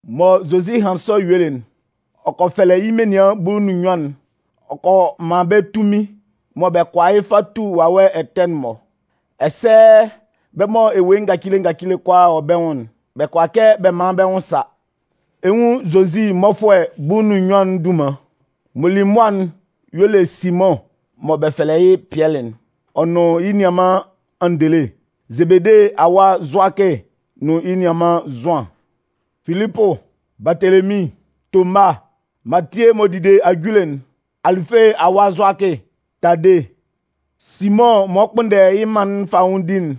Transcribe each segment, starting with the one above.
Mɔ Zozi hanlɩn sɔ yuelɩ'n, ɔ kɔ fɛlɛ yɩ́ menian bulu nʋn nnyuan'n, ɔ kɔ man bɛ́ tunmin mɔ bɛ kʋala yɩ́ fa tu wawɛ ɛtɛ'n-mɔ. Ɛsɛ bɛ́ mɔ ewue ngacile ngacile kʋalaa wɔ bɛ́ nwʋn'n, bɛ kʋala kɛ bɛ man bɛ́ nwʋn sa. Ɛ 'nwun Zozi mmɔfʋɛ bulu nʋn nnyuan'n dunman: m'ɔ li mʋa'n y'ɔ le Simʋn mɔ bɛ fɛlɛ yɩ́ Pɩɛlɩ'n, ɔ nʋn yɩ́ nianman Andele, Zebede awa Zʋakɩ nʋn yɩ́ nianman Zʋan, Filipʋ, Baatelemin, Toma, Matie m'ɔ dide ajule'n, Alɩfe awa Zʋakɩ, Tade, Simʋn m'ɔ kpʋnndɛ yɩ́ mân'n fanwʋndi'n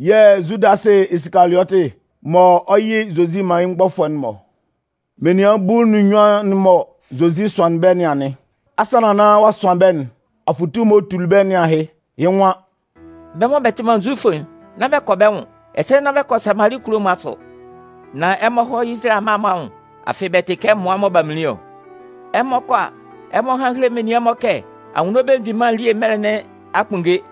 yɛ̂ Zudasɩ Isikaliɔtɩ mɔ ɔ 'yɩ Zozi man yɩ́ mgbɔfʋɛ'n-mɔ. Menian bulu nʋn nnyuan'n mɔ Zozi sʋanlɩn bɛ́ nɩn anɩn. Asannan nán ɔ'a sʋan bɛ́'n, afʋtu m'ɔ tuli bɛ́ nɩn ahɩ, yɩ́ nwan: “Bɛ́ mɔ bɛ tɩ man Zufʋ'n, nán bɛ kɔ bɛ́ nwʋn, ɛsɛ nán bɛ kɔ Samali kulo'n-mɔ asʋ. Nan ɛmɔ hɔ́ Izalayɛ amma'n-mɔ anwʋn. Afɩ bɛ tɩ kɛ mmʋa mɔ b'a minlin ɔ. Ɛmɔ 'kɔ a, ɛmɔ hán héle menian'n-mɔ kɛ Anwunno Belemgbin elie mɛlɛ nɩn a kpunnge.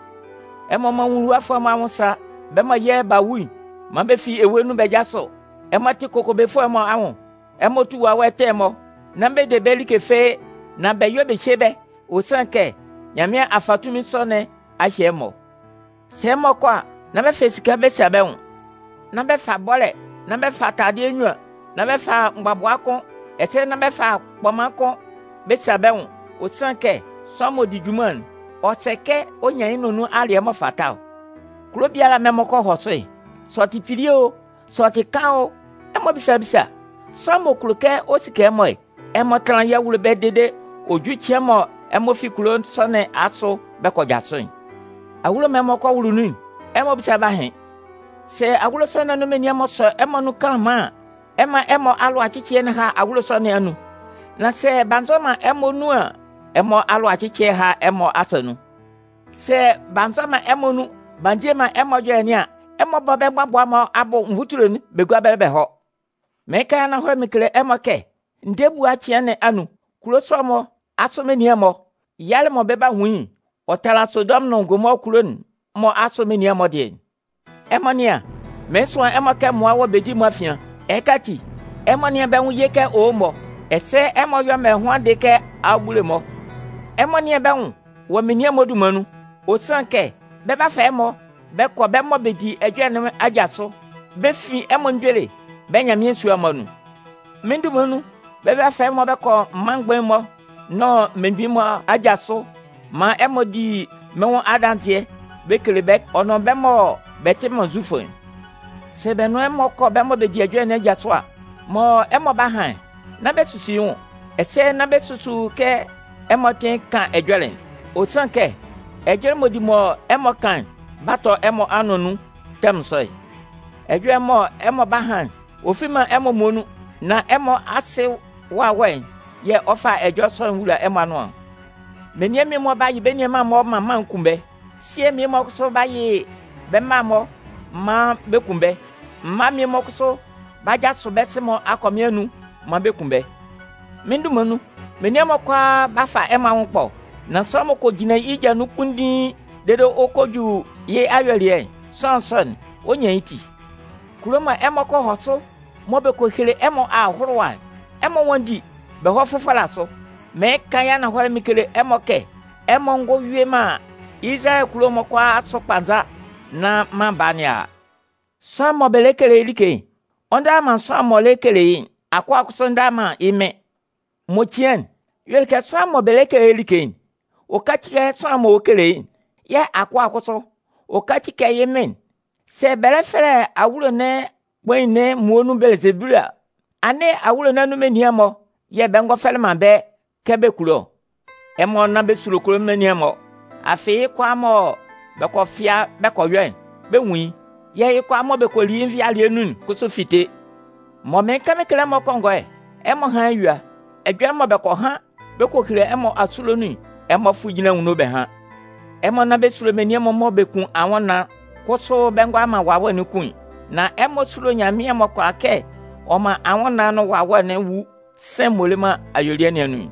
Ɛmɔ mán nwuluwafʋɛ'n-mɔ anwʋn sá, bɛ́ mɔ yɛ̂ b'a wu'n, man bɛ fi ewe nun bɛ jásʋ, ɛmɔ tɩ́ kokobefʋɛ'n-mɔ anwʋn, bɛ tú wawɛ ɛtɛ'n-mɔ. Nán bɛ de bɛ́ like fɩ́ɩ́, nan bɛ yɔ́ bɛ hyé bɛ́, ɔ sanlɩn kɛ Nyanmɩan a fa tunmin sɔ nɩn a hye ɛmɔ. Sɛ ɛmɔ 'kɔ a, nán bɛ fa esika fɩ́ɩ́ bɛ sa bɛ́ nwʋn. Nán bɛ fa bɔ́lɛ, nán bɛ fa taladɩɛ nnyuan, nán bɛ fa mgbabʋa kʋ́n, ɛsɛ nán bɛ fa kpɔman kʋ́n bɛ sa bɛ́ nwʋn. Ɔ sanlɩn kɛ sʋanlan m'ɔ di junman'n, ɔ sɛ kɛ ɔ nyan yɩ́ nʋan nun alɩɛ m'ɔ fata ɔ. “Kulo biala mɔ ɛmɔ kɔ hɔ sʋ'n, sɛ ɔ tɩ kpili o, sɛ ɔ tɩ kaan o, ɛmɔ bísa bísa, sʋanlan m'ɔ kulo kɛ ɔ sike ɛmɔ'n, ɛmɔ tánlan yɩ́ awulo ɛbɛlɛ dede ɔ jú cɩan mɔ ɛmɔ fi kulo sɔ nɩn asʋ bɛ 'jasʋ'n. Awulo mɔ ɛmɔ kɔ wʋlʋ nun'n, ɛmɔ bísa bɛ́ ahɩn. Sɛ awulo sɔ nɩn anun menian'n-mɔ sɔ ɛmɔ nun kanlanman an, ɛmɔ mán ɛmɔ alʋacɩcɩɛ'n há awulo sɔ nɩn anun. Nan sɛ b'a nzɔ man ɛmɔ nun an, ɛmɔ alʋacɩcɩɛ'n há ɛmɔ asa nun. Sɛ b'a nzɔ man ɛmɔ nun b'a ndie man ɛmɔ ɛjɔlɛ nɩn an, ɛmɔ bɔ́ bɛ́ mgbabʋa'n-mɔ abʋ nvutule'n bɛ gúa ɛbɛlɛ bɛ hɔ́. Mɩɩn kan yɩ́ ananhɔlɛ mɩn kele ɛmɔ kɛ ndɛɛ ebua cɩan nɩn anun, kulo sɔ nɩn asʋ menian'n-mɔ, yalɛ mɔ bɛ 'nwun yɩ́'n, ɔ 'tala Sodɔmʋn nʋn Gomɔɔ kulo'n-mɔ asʋ menian'n-mɔ dɩɛ'n. “Ɛmɔ nɩ́an, mɩɩn sʋan ɛmɔ kɛ mmʋa wɔ bedi'n-mɔ afian. Ɛhɩka ati, ɛmɔ nɩ́an bɛ́ nwʋn ye kɛ owo-mɔ, ɛsɛ ɛmɔ yɔ́ mɛlɛhʋandɩ kɛ abubule'n-mɔ. Ɛmɔ nɩ́an bɛ́ nwʋn wɔ menian'n-mɔ dunman nun. Ɔ sanlɩn kɛ bɛ 'ba fa ɛmɔ bɛ kɔ bɛ́ mɔ bɛ di ɛjɔlɛ nɩn aja sʋ. Bɛ 'fin ɛmɔ mgbele bɛ́ Nyanmɩan sua'n-mɔ anun. Mɩ́n dunman nun, bɛ 'ba fa ɛmɔ bɛ kɔ mân mgbain'n-mɔ nʋn mmelemgbin'n-mɔ aja sʋ maan ɛmɔ di mɩ́n nwʋn adanzɩɛ bɛ kele bɛ́ ɔ nʋn bɛ́ mɔ bɛ tɩ man Zufʋ'n. Sɛ bɛ nʋn ɛmɔ kɔ bɛ́ mɔ bɛ di ɛjɔlɛ nɩn aja sʋ a, mɔ ɛmɔ 'ba han'n, nán bɛ susu yɩ́ nwʋn, ɛsɛ nán bɛ susu kɛ ɛmɔ 'kpɩn kan ɛjɔlɛ'n. Ɔ sanlɩn kɛ ɛjɔlɛ m'ɔ di mɔ ɛmɔ kan'n 'ba tɔ ɛmɔ anʋan anun tɛmʋn sɔ'n. Ɛjɔlɛ'n mɔ ɛmɔ 'ba han'n, ɔ fi man ɛmɔ muonun, nan ɛmɔ Asɩ'n Wawɛ'n yɛ̂ ɔ 'fa ɛjɔlɛ sɔ'n wula ɛmɔ anʋan ɔ. “Menian mmie-mɔ 'ba yɩ bɛ́ nianman'n-mɔ man maan bɛ kun bɛ́. Sɩɛ mmie-mɔ kʋsʋ 'ba yɩ bɛ́ mma'n-mɔ man maan bɛ kun bɛ́. Mma mmie-mɔ kʋsʋ 'ba jasʋ bɛ́ sɩ-mɔ akɔmɩn anun maan bɛ kun bɛ́. Mɩ́n dunman nun, menian'n-mɔ kʋalaa 'fa ɛmɔ anwʋn ɛkpɔ. Nan sʋanlan m'ɔ kɔ jinlan yɩ́ ja nun kpunndiin dede ɔ kɔ ju yɩ́ ayuelɩɛ'n, sʋanlan sɔ'n, ɔ 'nyan yɩ́ ti. Kulo mɔ ɛmɔ kɔ hɔ sʋ mɔ bɛ lɛ kele ɛmɔ ahʋlʋwa'n, ɛmɔ nwánndi bɛ hɔ́ fʋfɔlɛ asʋ. Mɩɩn kan yɩ́ ananhɔlɛ mɩn kele ɛmɔ kɛ ɛmɔ ngɔ yue man Izalayɛ kulo'n-mɔ kʋalaa asʋ kpanza nán Mân Baa nɩn a a. “Sʋanlan mɔ bɛ lɛ kele yɩ́ like'n, ɔ ndala man sʋanlan'n m'ɔ lɛ kele yɩ́'n. Akʋa'n kʋsʋ ndala man yɩ́ mɩn'n. M'ɔ cian'n, y'ɔ le kɛ sʋanlan'n mɔ bɛ lɛ kele yɩ́ like'n, ɔ káci kɛ sʋanlan'n m'ɔ lɛ kele yɩ́ like'n. Yɛ̂ akʋa'n kʋsʋ, ɔ káci kɛ yɩ́ mɩn'n. Sɛ bɛ lɛ fɛlɛ awulo kpain'n muonun Bɛlɩzebulu a, nán awulo nɩn anun menian'n-mɔ yɛ̂ bɛ ngɔ fɛlɛ bɛ́ kɛ bɛ kulo ɔ! “Ɛmɔ nán bɛ sulo kulo menian'n-mɔ. Afɩ yɩ́ kʋalaa mɔ bɛ kɔ fɩa bɛ kɔ yɔ'n, bɛ 'nwun yɩ́. Yɛ̂ ɛjɔlɛ mɔ bɛ kɔ li yɩ́ nvɩalɩɛ nun'n kʋsʋ 'fite. Mɔ mɩɩn kan mɩn kele ɛmɔ kɔngɔɛ'n, ɛmɔ hán yɩ́ eyua. Ɛjɔlɛ mɔ bɛ kɔ han bɛ kɔ hele ɛmɔ asulo nun'n, ɛmɔ fʋ́ jínlan anwunno bɛ hán. Ɛmɔ nán bɛ sulo menian'n-mɔ mɔ bɛ kun anwʋnnaan'n kʋsʋ bɛ ngʋala man wawɛ'n kun'n. Nan ɛmɔ súlo Nyanmɩan mɔ kʋala kɛ ɔ man anwʋnnaan'n nʋn wawɛ'n wu sɩ̂n'n m'ɔ le man ayuelɩɛ nɩn anun'n.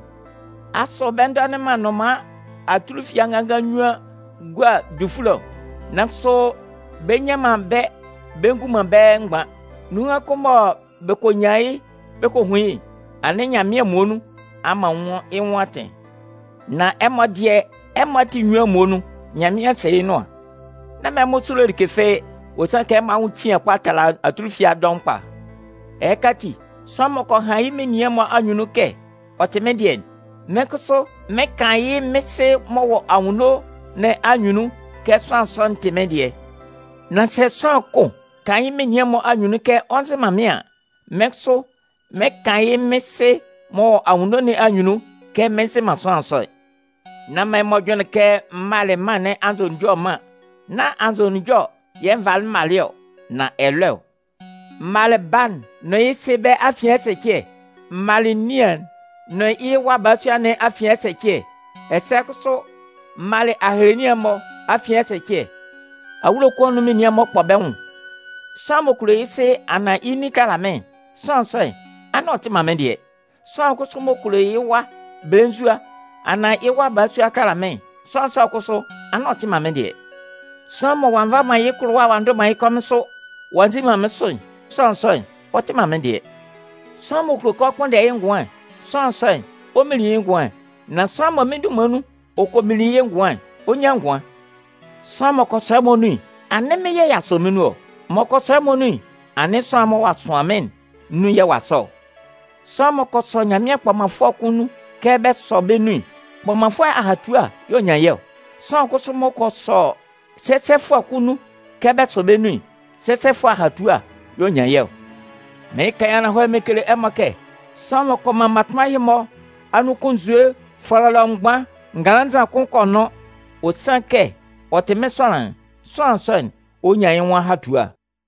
Asʋ bɛ ndɔnɩn man nnʋnman atulufia nganngan nnyuan gua dufule ɔ? Nan kʋsʋ bɛ nnyan man bɛ́ bɛ ngun man bɛ́ mgban. Nunhan kʋn mɔ bɛ kɔ nyan yɩ́ bɛ kɔ hun yɩ́'n, anɩn Nyanmɩan muonun a man yɩ́ nwʋn atɩn. Nan ɛmɔ dɩɛ, ɛmɔ ati enyuan'n muonun, Nyanmɩan sɩ yɩ́ nʋan. Nán man ɛmɔ sulo like fɩ́ɩ́. Ɔ sanlɩn kɛ ɛmɔ anwʋn cian kpa tala atulufia dɔʋn kpa. “Ɛhɩka ati, sʋanlan m'ɔ kɔ han yɩ́ menian'n-mɔ anyunnun kɛ ɔ tɩ mɩ́n dɩɛ'n, mɩ́n kʋsʋ mɩn 'kan yɩ́ mɩ́n Sɩ m'ɔ wɔ anwunno nɩn anyunnun kɛ sʋanlan sɔ'n tɩ mɩ́n dɩɛ. Nan sɛ sʋanlan kʋn kan yɩ́ menian'n-mɔ anyunnun kɛ ɔ nzɩ man mɩ́n an, mɩ́n kʋsʋ mɩn 'kan yɩ́ mɩ́n Sɩ m'ɔ wɔ anwunno nɩn anyunnun kɛ mɩn nzɩ man sʋanlan sɔ'n! “Nán man ɛmɔ jʋnlɩn kɛ m malɩ mân nɩn anzʋnunjɔ ɛman. Nán anzʋnunjɔ yɛ̂ n valɩ malɩ ɔ, nan ɛlɔɛ ɔ. M malɩ baa'n nʋn yɩ́ sɩ bɛ́ afian ɛsɛcɩɛ. M malɩ nian'n nʋn yɩ́ wa balasua nɩn afian ɛsɛcɩɛ. Ɛsɛ kʋsʋ m malɩ ahelenian'n-mɔ afian ɛsɛcɩɛ. Awulo kʋn anun menian'n-mɔ 'kpɔ bɛ́ nwʋn. “Sʋanlan m'ɔ kulo yɩ́ sɩ anaan yɩ́ nin tala mɩ́n'n, sʋanlan sɔ'n, anɩn ɔ tɩ man mɩ́n dɩɛ. Sʋanlan kʋsʋ m'ɔ kulo yɩ́ wa belenzua anaan yɩ́ wa balasua tala mɩ́n'n, sʋanlan sɔ'n kʋsʋ, anɩn ɔ tɩ man mɩ́n dɩɛ. Sʋanlan mɔ ɔ'a nva man yɩ́ kʋlʋwa'n ɔ'a ndʋ man yɩ́ kɔmɩn sʋ, ɔ'a nzi man mɩ́n sʋ'n, sʋanlan sɔ'n, ɔ tɩ man mɩ́n dɩɛ. Sʋanlan m'ɔ kulo kɛ ɔ kpʋnndɛ yɩ́ ngʋan'n, sʋanlan sɔ'n, ɔ 'minlin yɩ́ ngʋan'n. Nan sʋanlan mɔ mɩ́n dunman nun ɔ kɔ minlin yɩ́ ngʋan'n, ɔ 'nyan ngʋan. “Sʋanlan m'ɔ kɔ sɔ ɛmɔ nun'n, anɩn mɩ́n yɛ̂ ɔ'a sɔ mɩ́n nun ɔ. M'ɔ kɔ sɔ mɩ́n nun'n, anɩn sʋanlan'n m'ɔ sʋanlɩn mɩ́n'n nun yɛ̂ ɔ'a sɔ ɔ. Sʋanlan m'ɔ kɔ sɔ Nyanmɩan kpɔmanfʋɛ kʋn nun kɛ bɛ sɔ bɛ́ nun'n, kpɔmanfʋɛ ahatua yɛ ɔ 'nyan yɩ́ ɔ. Sʋanlan kʋsʋ m'ɔ kɔ sɔ sɛsɛfʋɛ kʋn nun kɛ bɛ sɔ bɛ nun'n, sɛsɛfʋɛ ahatua yɛ̂ ɔ 'nyan yɩ́ ɔ. Mɩɩn kan yɩ́ ananhɔlɛ mɩn kele ɛmɔ kɛ: sʋanlan m'ɔ kɔ man mmatʋnman ɛhɩ-mɔ anun kʋn nzue fɔlɔlɔ mgban nganlannzan kʋn kɔ nʋn, ɔ sanlɩn kɛ ɔ tɩ mɩ́n sʋanlan'n, sʋanlan sɔ'n, ɔ 'nyan yɩ́ nwʋn ahatua.”